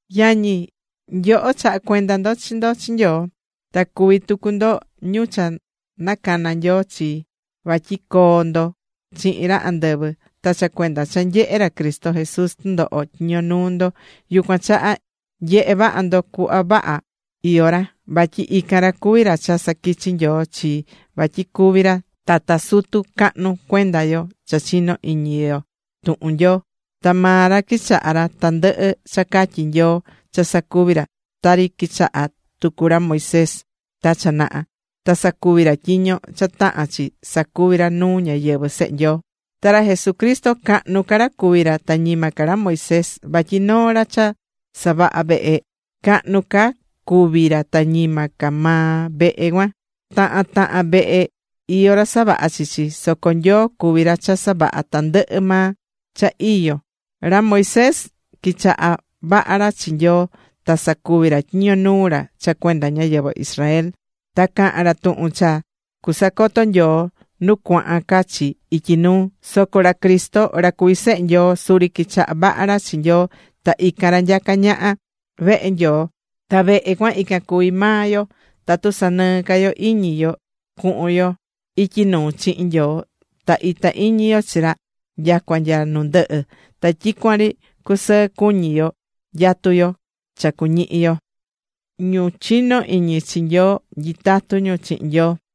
Yañi, nyoho chaha̱ cuenda ndo chi ndo chi Nyoo. Ta cuví tucu ndo ñu cha nacana̱ Nyoo chii vatyi coo ndo chihin ra andɨvɨ. Ta cha cuenda cha nyehe̱ ra Cristo Jesús tɨndoho tyiño nuu ndo, yucuan chaha, nye̱he vaha ndo cuhva vaha iyó ra. Vatyi ican ra cuví ra cha saquichi̱ Nyoo chi vatyi cuví ra tata sutu cahnu cuenda yo cha chinó iñí yo tuhun Nyoo. Ta maa ra quichaha̱ ra tandɨhɨ cha catyi̱ Nyoo cha sacuvi ra, tari quichaha̱ tucu ra Moisés ta cha naha, ta sacuvi̱ ra tyiño cha taha̱n chi sacuvi ra nuu ñáyɨvɨ sehe Nyoo. Ta ra Jesucristo cahnu ca ra cuví ra, ta ñima ca ra Moisés. Vatyi noo ra cha savahá vehe, cahnu ca cuví ra ta ñima ca maa vehe cuan. Tahan tahan vehe, iyó ra savaha̱ chi chi, soco Nyoo cuví ra cha savaha̱ tandɨhɨ maa cha iyó. Ra Moisés, quichaha̱ vaha ra chi Nyoo ta sacuvi̱ ra tyiño nuu ra cha cuenda ñáyɨvɨ Israel ta caha̱n ra tuhun cha cusacoto Nyoo nu cuahan ca chi ityi nuu. Soco ra Cristo ra cuví Sehe Nyoo, suri quichaha̱ vaha ra chi Nyoo ta ican ra nyacá ñaha vehe Nyoo. Ta vehe cuan ican cuví maa yo, tatu sanɨɨ́ ca yo iñi yo cuhun yo ityi nuu chihin Nyoo ta itá iñi yo chi ra nyacua nya nu ndɨhɨ, ta tyicuan ri cusɨɨ cuñí yo nyatú yo cha cuñihi yo.Ñu chinó iñi chi Nyoo, nyitatú ñu chihin Nyoo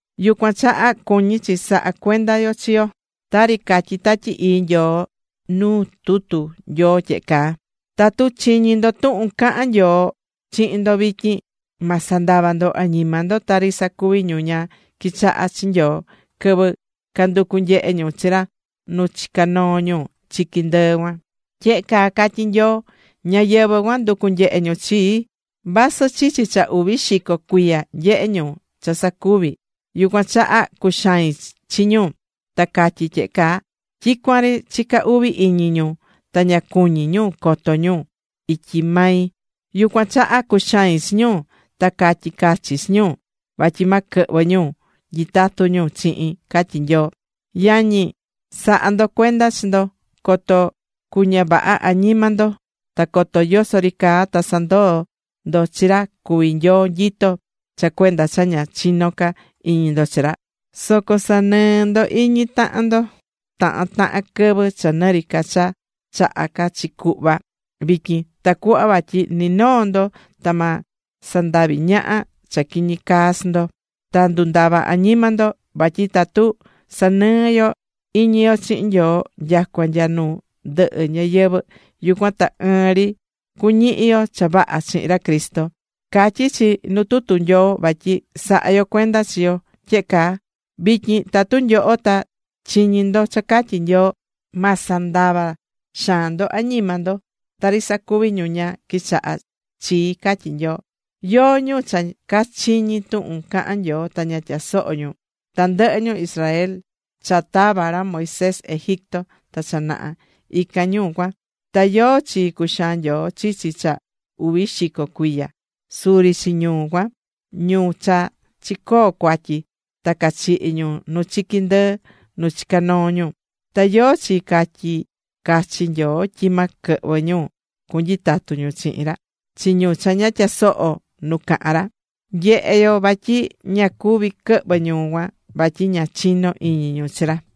Yucuan chaha cuñí chi saha cuenda yo chi yo, tari catyí Tatyi Ii Nyoo nuu tutu Nyoo tyehe caa: Tatu chiñí ndo tuhun cahán Nyoo chihin ndo vityin, ma sandava ndo añima ndo, tari sacuvi̱ ñu ña quichaha̱ chi Nyoo quɨvɨ canducú nyehe ñu chi ra nu chica̱ noo ñu chiqui ndɨɨ cuan. Tyehe caa catyí Nyoo: Ñáyɨvɨ cuan nducu̱ nyehe ñu chii, vasɨ chichi cha uvi xico cuiya nyehe̱ ñu cha sacuvi̱. Yucuan chaha cuxai̱n chi ñu, ta catyí tyehe caa: “Tyicuan ri chicá uvi iñi ñu, ta ña cuñí ñu coto ñu ityi mai.” Yucuan chaha cuxai̱n chi ñu, ta catyi̱ cachi chi ñu, vatyi ma quɨhvɨ ñu nyitatu ñu chihin, catyí Nyoo. Yañi, sa̱ha ndo cuenda chi ndo coto cu ña vaha añima ndo ta coto yoso ri caa ta sandoo ndo chi ra cuví Nyoo nyitó cha cuenda cha ña chinó ca iñi ndo chi ra. Soco sa̱nɨɨ ndo iñi tahan ndo tahan tahan quɨvɨ, cha nɨ ri ca cha chahá ca chi cuhva vityin, tacuhva vatyi ni noo ndo ta ma sandavi ñaha cha quiñi caa chi ndo, ta ndundava añima ndo. Vatyi tatu sanɨɨ́ yo iñi yo chihin Nyoo nyacua nya nu ndɨhɨ ñayɨvɨ̱, yucuan ta ɨɨn ri cuñihi yo cha vaha chihin ra Cristo. Catyí chi nu tutu Nyoo vatyi sa̱ha yo cuenda chi yo tyehe caa: Vityin tatu nyoho ta chiñí ndo cha catyí Nyoo. Ma sandava xaan ndo añima ndo, tari sacuvi̱ ñu ña quichaha̱ chii, catyí Nyoo. ¿Yóó ñu cha cachiñi̱ tuhun caha̱n Nyoo ta ña tyasoho̱ ñu? Tandɨhɨ ñu Israel cha tava̱ ra Moisés Egipto ta cha naha, ican ñu cuan. Ta ¿yóó chi cuxaa̱n Nyoo chichi cha uvi xico cuiya? Suri chi ñu cuan, ñu cha chicoo̱ cuatyi. Ta cachihi̱ ñu nu chiqui ndɨɨ nu chica̱ noo ñu. ¿Ta yóó chi catyi̱ cachi Nyoo tyi ma quɨhvɨ ñu, cunyitatu ñu chihin ra? Chi ñu cha ña tyasoho̱ nu cahán ra. Nyehé yo vatyi ña cuvi̱ quɨhvɨ ñu cuan vatyi ña chino̱ iñi ñu chi ra.